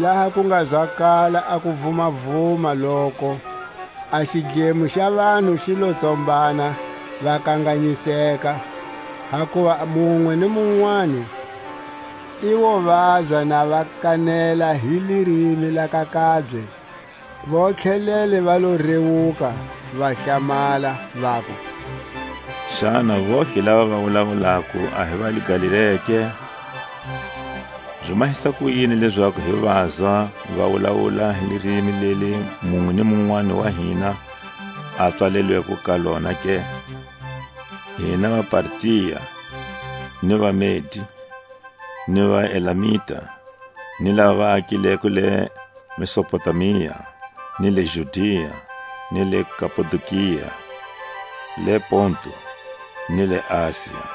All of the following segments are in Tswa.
Laha ku nga zwakala a kuvumavuma loko, a xidlemo xa vanhu xi lo tsombana, va kanganyiseka, hakuva munwe ni munwani i wo vazwa na va kanela hi lirimi la ka kabye. Vontlhelele va lo riwuka, va hlamala, vaku: Xana vontlhe lava va wulawulako a hi va le Galilea ke? Zi mahisa kuyini lezaku hi vazwa va wulawula hi lirimi leli munwe ni munwani wa hina a pswalelweko ka lona ke? Hina vaPartia, ni vaMedi, ni vaElamita, ni lava va akileko le Mesopotamia, ni le Judia, ni le Kapadokia, le Pontu, ni le Asia,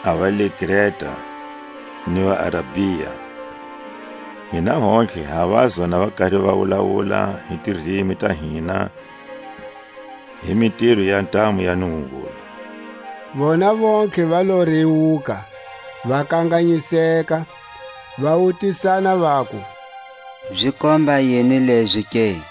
a va le Kreta, ni vaArabia, hina hontlhe ha vazwa na va kari va wulawula hi tirimi ta hina hi mitiro ya ntamu ya Nungungulu. Vona vontlhe va lo riwuka, va kanganyiseka, va wutisana vaku: Zi komba yini lezi ke?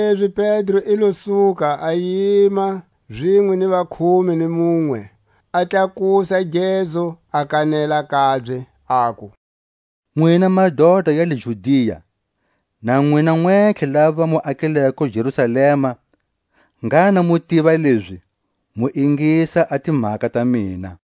Kanilezi Pedro i lo suka, a yima zinwe ni vakhume ni munwe, a tlakusa gezu, a kanela kabye, aku: Nwina madota ya le Judia, na nwina nwentlhe lava mu akileko Jerusalema, ngha na mu tiva lezi, mu ingisa a timhaka ta mina.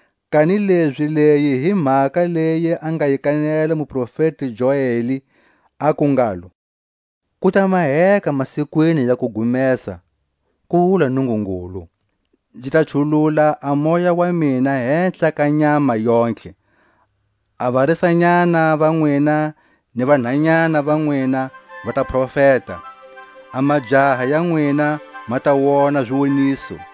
Kanilezi leyi hi mhaka leyi a nga yi kanela muprofeti Joeli, a ku ngalo: Ku ta maheka masikwini ya kugumesa, ku wula Nungungulu, Nzi ta chulula a Moya wa mina hehla ka nyama yontlhe; A varisanyana va nwina ni vanhanyana va nwina va ta profeta, A majaha ya nwina ma ta wona ziwoniso,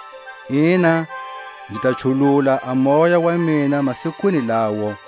Ina, nzi ta chulula a Moya wa mina masikwini lawo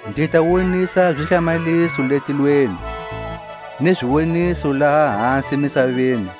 Nzi ta wonisa zihlamaliso le tilweni, Ni ziwoniso laha hasi misaveni: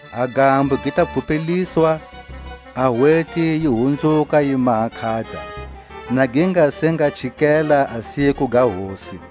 A gambo gi ta pfhupeliswa, A hweti yi hunzuka yi maha nkhata, Na gi nga se nga chikela a siku ga Hosi,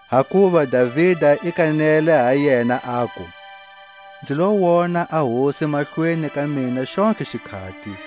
Hakuva Davida i kanele ha yena, aku: Nzi lo wona a Hosi mahlweni ka mina xontlhe xikhati,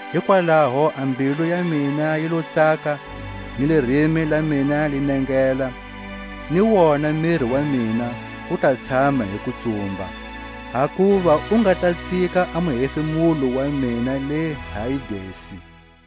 Hikwalaho a mbilu ya mina yi lo tsaka, ni lirimi la mina li nengela, Ni wona miri wa mina wu ta tshama hi kutsumba. Hakuva u nga ta tsika a muhefemulo wa mina le Hayidesi,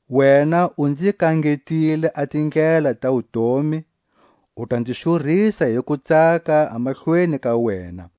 Wena u nzi kangetile a tindlela ta wutomi, U ta nzi xurisa hi kutsaka a mahlweni ka wena.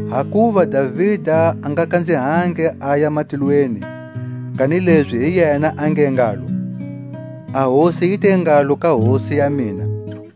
Hakuva Davida a nga kanzihangi aya matilweni, kanilezi hi yena a nge ngalo: A Hosi yi te ngalo ka hosi ya mina: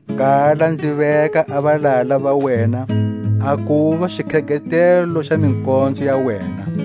Kala nzi veka a valala va wena a kuva Xikhegetelo xa mikonzo ya wena.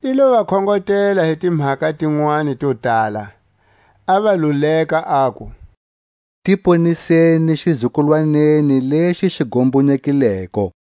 I lo va khongotela hi timhaka tinwani to tala, a va luleka, aku: Ti poniseni xizukulwaneni lexi xi gombonyekileko.